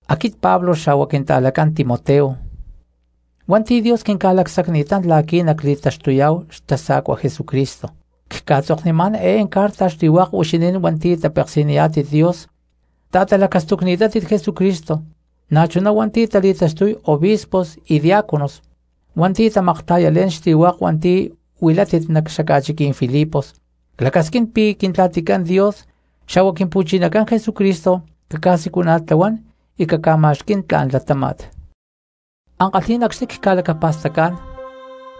Aquit Pablo xa̠hua quinta̠lacán Timoteo hua̠nti̠ Dios quinca̠lacsacni̠tán la̠qui̠ nacli̠taxtuyá̠hu xtasa̠cua Jesucristo, cca̠tzoknimá̠n eé carta xli̠hua̠k huixinín hua̠nti̠ tapeksi̠niyá̠tit Dios ta̠talacastucni̠tátit Jesucristo, na̠chuná hua̠nti̠ tali̠taxtuy obispos y diaconos hua̠nti̠ tamakta̠yalé̠n xli̠hua̠k hua̠nti̠ huilátit nac xaca̠chiquí̠n Filipos. Clacasquín pi̠ Quintla̠ticán Dios xa̠hua Quimpu̠chinacán Jesucristo caca̠siculana̠tlahuán y caca̠ma̠xquí̠n tla̠n latáma̠t. Ankalhí̠n acxni̠ cca̠lacapa̠stacá̠n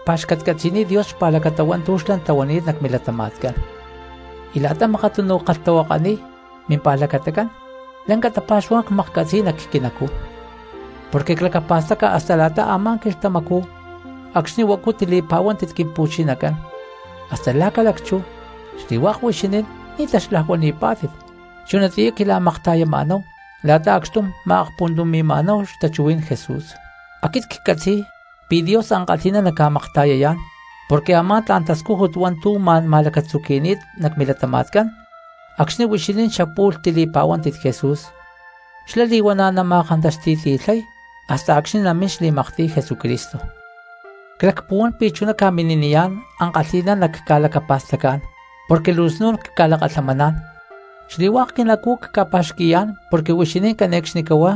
cpa̠xcatcatzi̠niy Dios xpa̠lacata hua̠ntu̠ xlá tlahuani̠t nac milatama̠tcán. Y la̠ta makatunu ckalhtahuakaniy mimpa̠lacatacán lanca tapa̠xuhuá̠n cmaklhcatzi̠y nac quinacú, porque clacapa̠staca hasta la̠ta a̠má quilhtamacú acxni̠ huacu tili̠pa̠huántit Quimpu̠chinacán hasta la̠ ca̠lacchú xli̠hua̠k huixinín ni̠ taxlajuani̠pá̠tit chunatiyá quila̠makta̠yamá̠hu la̠ta acxtum ma̠akahuani̠má̠hu xtachuhuí̠n Jesús. Aquit ccatzi̠y pi̠ Dios ankalhi̠ná naca̠makta̠yayá̠n porque a̠má tla̠n tascújut hua̠ntu̠ ma̠n ma̠lacatzuqui̠ni̠t nac milatama̠tcán acxni̠ huixinín xapu̠lh tili̠pa̠huántit Jesús, xlá li̠huana̠ nama̠kantaxti̠ti̠lhay hasta acxni̠ namín xli̠maktiy Jesucristo. Clacpuhuán pi̠ chuná ca̠mini̠niyá̠n ankalhi̠ná nacca̠lacapa̠stacá̠n porque luu snu̠n cca̠lakalhamaná̠n, xli̠hua̠k quinacú cca̠pa̠xqui̠yá̠n porque huixinín cane̠cxnicahuá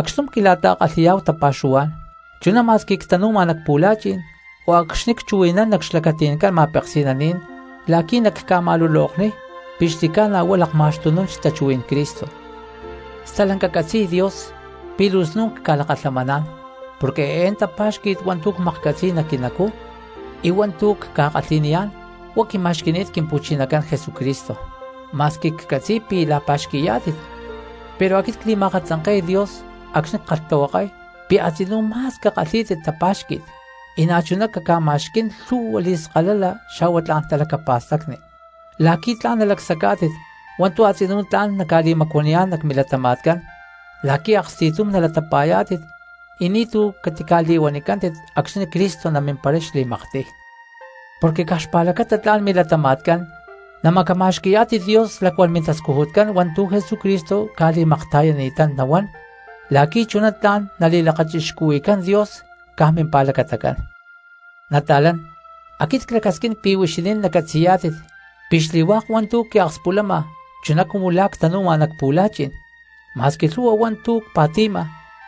acxtum quila̠ta̠kalhi̠yá̠hu tapa̠xuhuá̠n, chuná ma̠squi ctanu̠ma nac pu̠la̠chi̠n o acxni̠ cchuhui̠nán nac xlacati̠ncán ma̠peksi̠naní̠n la̠qui̠ nacca̠ma̠lulokniy pi̠ xli̠ca̠na huá lakma̠xtunún xtachuhuí̠n Cristo. Stalanca catzi̠y Dios pi̠ luu snu̠n cca̠lakalhamaná̠n porque eé tapa̠xqui̠t hua̠ntu̠ cmaklhcatzi̠y nac quinacú y hua̠ntu̠ cca̠kalhi̠niyá̠n huá quima̠xqui̠ni̠t Quimpu̠chinacán Jesucristo. Ma̠squi ccatzi̠y pi̠ la̠pa̠xqui̠yá̠tit pero aquit cli̠ma̠akatzanke̠y Dios acxni̠ ckalhtahuakay pi̠ a̠tzinú ma̠s cakalhí̠tit tapa̠xqui̠t, y na̠chuná caca̠ma̠xquí̠n lhu̠hua li̠skalala xa̠hua tla̠n talacapa̠stacni, la̠qui̠ tla̠n nalacsacá̠tit hua̠ntu̠ a̠tzinú tla̠n naca̠li̠macuaniyá̠n nac milatama̠tcán la̠qui̠ aksti̠tum nalatapa̠yá̠tit y ni̠tu̠ catica̠li̠huanicántit acxni̠ Cristo namimparay xli̠maktiy. Porque caj xpa̠lacata tla̠n milatama̠tcán namacama̠xqui̠yá̠tit Dios lacuán mintascujutcán hua̠ntu̠ Jesucristo ca̠li̠makta̠yani̠tán nahuán la̠qui̠ chuná tla̠n nali̠lakachixcuhui̠cán Dios caj mimpa̠lacatacán. Nata̠lán, aquit clacasquín pi̠ huixinín nacatzi̠yá̠tit pi̠ xli̠hua̠k hua̠ntu̠ quiakspulama chuná cumu la̠ ctanu̠ma nac pu̠la̠chi̠n, ma̠squi lhu̠hua hua̠ntu̠ cpa̠ti̠ma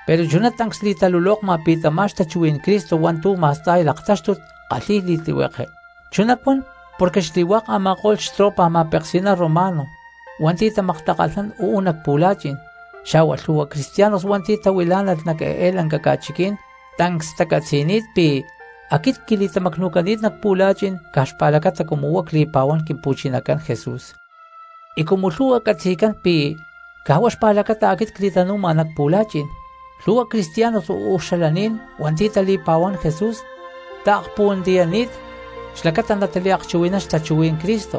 pero chuná tancs li̠talulokma pi̠ tamá xtachuhuí̠n Cristo hua̠ntu̠ ma̠sta̠y laktáxtut kalhi̠y li̠tlihueke. Chuná cuan porque xli̠hua̠k a̠ma̠ko̠lh xtropa ma̠peksi̠ná romano hua̠nti̠ tamaktakalhnán uú nac pu̠la̠chi̠n, xa̠hua lhu̠hua cristianos hua̠nti̠ tahuilá̠nalh nac eé lanca ca̠chiquí̠n tancs tacatzi̠ni̠t pi̠ aquit quili̠tamacnu̠cani̠t nac pu̠la̠chi̠n caj xpa̠lacata cumu huá cli̠pa̠huán Quimpu̠chinacán Jesús. Y cumu lhu̠hua catzi̠cán pi̠ caj huá xpa̠lacata aquit cli̠tanu̠ma nac pu̠la̠chi̠n, lhu̠hua cristianos uú xalaní̠n hua̠nti̠ tali̠pa̠huán Jesús taakpuhuantiyani̠t xlacata nataliakchuhui̠nán xtachuhuí̠n Cristo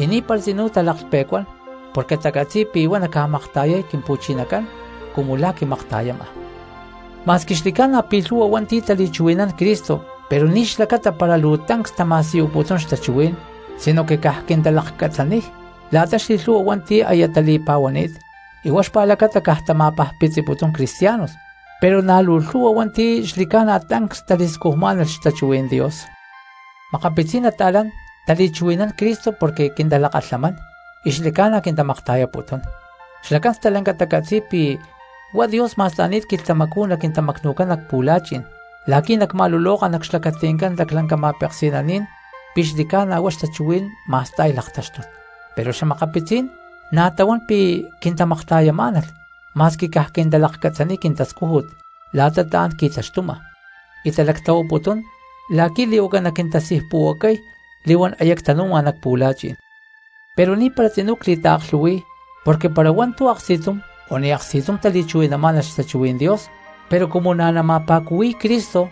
y ni̠para tzinú talaklhpe̠cuán porque tacatzi̠y pi̠ huá naca̠makta̠yay Quimpu̠chinacán cumu la̠ quimakta̠yama. Ma̠squi xli̠ca̠na pi̠ lhu̠hua hua̠nti̠ tali̠chuhui̠nán Cristo pero ni̠ xlacata para luu tancs tama̠siyuputún xtachuhuí̠n sinoque caj quintalakcatzaniy la̠ta xli̠lhu̠hua hua̠nti̠ aya tali̠pa̠huani̠t y huá xpa̠lacata caj tama̠pajpitziputún cristianos; pero na̠ luu lhu̠hua hua̠nti̠ xli̠ca̠na tancs tali̠scujmá̠nalh xtachuhuí̠n Dios. Makapitzí̠n nata̠lán tali̠chuhui̠nán Cristo porque quintalakalhamán y xli̠ca̠na quintamakta̠yaputún. Xlacán stalanca tacatzi̠y pi̠ huá Dios ma̠sta̠ni̠t quilhtamacú naquintamacnu̠cán nac pu̠la̠chi̠n la̠qui̠ nacma̠luloka nac xlacati̠ncán laclanca ma̠peksi̠naní̠n pi̠ xli̠ca̠na huá xtachuhuí̠n ma̠sta̠y laktáxtut. Pero xa̠makapitzí̠n na̠ tahuán pi̠ quintamakta̠yamá̠nalh ma̠squi caj quintalakcatzaniy quintascújut la̠ta tla̠n qui̠taxtuma y talactlahuaputún la̠qui̠ li̠huaca naquintasijpu̠huacay li̠huán aya ctanu̠ma nac pu̠la̠chi̠n. Pero ni̠para tzinú cli̠taaklhu̠hui̠y porque para hua̠ntu̠ aksti̠tum o ni̠ aksti̠tum tali̠chuhui̠namá̠nalh xtachuhuí̠n Dios, pero cumu na̠ nama̠pa̠cuhui̠y Cristo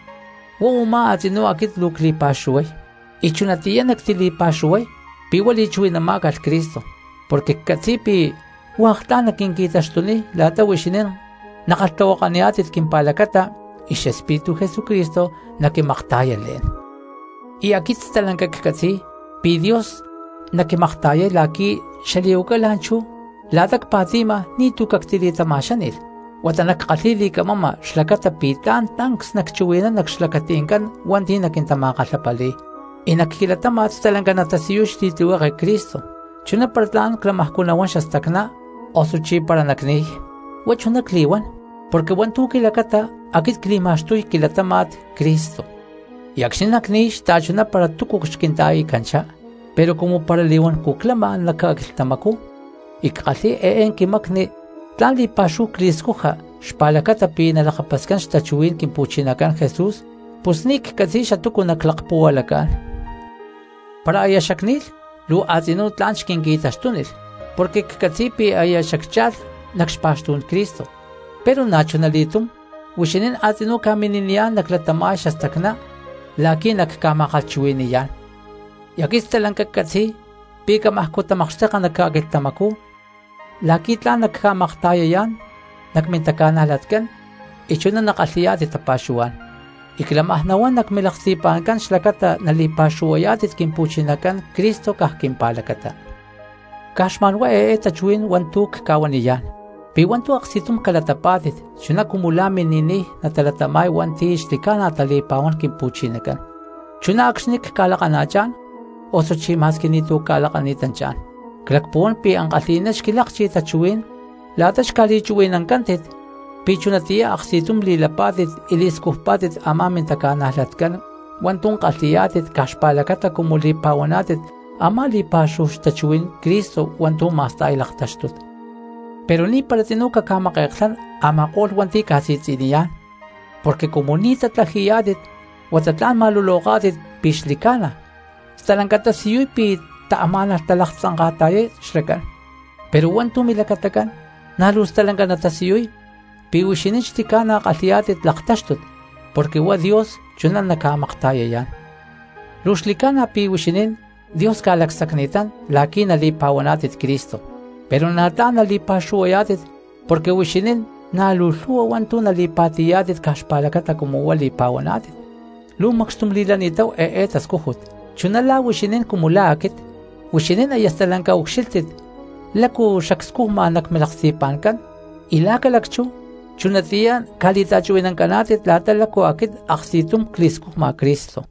huá u̠má a̠tzinú aquit luu cli̠pa̠xuhuay. Y chunatiyá nactili̠pa̠xuhuay pi̠ huá li̠chuhui̠namá̠calh Cristo, porque ccatzi̠y pi̠ hua̠k tla̠n naquinqui̠taxtuniy la̠ta huixinín nakalhtahuakaniyá̠tit quimpa̠lacata y xEspíritu Jesucristo naquimakta̠yalé̠n. Y aquit stalanca ccatzi̠y pi̠ Dios naquimakta̠yay la̠qui̠ xali̠huaca la̠nchú la̠ta cpa̠ti̠nama ni̠tu̠ cactili̠tama̠xáni̠lh, huata nackalhi̠y li̠camama xlacata pi̠ tla̠n tancs nacchuhui̠nán nac xlacati̠ncán hua̠nti̠ naquintama̠kalhapali̠y, y nac quilatáma̠t stalanca natasiyuy xli̠tlihueke Cristo, chuná para tla̠n clamajcú nahuán xastacná osuchí para nacni̠y. Huá chuná cli̠huán porque hua̠ntu̠ quilacata aquit cli̠ma̠xtuy quilatama̠t Cristo, y acxni̠ nacni̠y xta̠chuná para túcu xquinta̠i̠canchá. Pero cumu para li̠huancú clama nac ca̠quilhtamacú y ckalhi̠y eé quimacni tla̠n li̠pa̠xúhu cli̠scuja xpa̠lacata pi̠ nalakapascán xtachuhuí̠n Quimpu̠chinacán Jesús, pus ni̠ ccatzi̠y xatúcu naclakpuhualacá̠n. Para aya xacni̠lh luu a̠tzinú tla̠n xquinqui̠taxtúnilh porque ccatzi̠y pi̠ aya xaccha̠lh nac xpa̠xtú̠n Cristo, pero na̠chuna li̠túm huixinín a̠tzinú ca̠mini̠niyá̠n caclatáma̠lh xastacná la̠qui̠ nacca̠ma̠kalhchuhui̠ni̠yá̠n. Y aquit stalanca ccatzi̠y pi̠ camajcú tamakxteka nac ca̠quilhtamacú la̠qui̠ tla̠n nacca̠makta̠yayá̠n nac mintaca̠najlatcán y chuná nakalhi̠yá̠tit tapa̠xuhuá̠n. Y clamaj nahuán nac milaksti̠pa̠ncán xlacata nali̠pa̠xuhuayá̠tit Quimpu̠chinacán Cristo caj quimpa̠lacata. Caj xma̠nhuá eé tachuhuí̠n hua̠ntu̠ cca̠huaniyá̠n: pi̠ hua̠ntu̠ aksti̠tum calatapá̠tit chuná cumu la̠ mini̠niy natalatama̠y hua̠nti̠ xli̠ca̠na tali̠pa̠huán Quimpu̠chinacán, chuná acxni̠ cca̠lakana̠chá̠n osuchí ma̠squi ni̠tu̠ cca̠lakani̠tanchá̠n. Clakpuhuán pi̠ ankalhi̠ná xquilakchi tachuhuí̠n la̠ta xca̠li̠chuhui̠nancántit pi̠ chunatiyá aksti̠tum li̠lapá̠tit y li̠scujpá̠tit a̠má mintaca̠najlatcán hua̠ntu̠ kalhi̠yá̠tit caj xpa̠lacata cumu li̠pa̠huaná̠tit a̠má li̠pa̠xúhu xtachuhuí̠n Cristo hua̠ntu̠ ma̠sta̠y laktáxtut. Pero ni̠para tzinú caca̠make̠klhán a̠ma̠ko̠lh hua̠nti̠ ca̠si̠tzi̠niyá̠n, porque cumu ni̠ natatlaji̠yá̠tit huata tla̠n nama̠luloká̠tit pi̠ xli̠ca̠na, stalanca tasiyuy pi̠ taamá̠nalh talaktzanka̠ta̠yay xlacán, pero hua̠ntu̠ milacatacán na̠ luu stalanca natasiyuy pi̠ huixinín xli̠ca̠na kalhi̠yá̠tit laktáxtut porque huá Dios chuná naca̠makta̠yayá̠n. Luu xli̠ca̠na pi̠ huixinín Dios ca̠lacsacni̠tán la̠qui̠ nali̠pa̠huaná̠tit Cristo, pero na̠ tla̠n nali̠pa̠xuhuayá̠tit porque huixinín na̠ luu lhu̠hua hua̠ntu̠ nali̠pa̠ti̠yá̠tit caj xpa̠lacata cumu huá li̠pa̠huaná̠tit. Luu macxtum li̠lani̠táhu eé tascújut, chuná la̠ huixinín cumu la̠ aquit; huixinín aya stalanca ucxílhtit lácu xacscujma nac milaksti̠pa̠ncán y la̠ ca̠lacchú chunatiyá ca̠li̠ta̠chuhui̠nancaná̠tit la̠ta lácu aquit aksti̠tum cli̠scujma Cristo.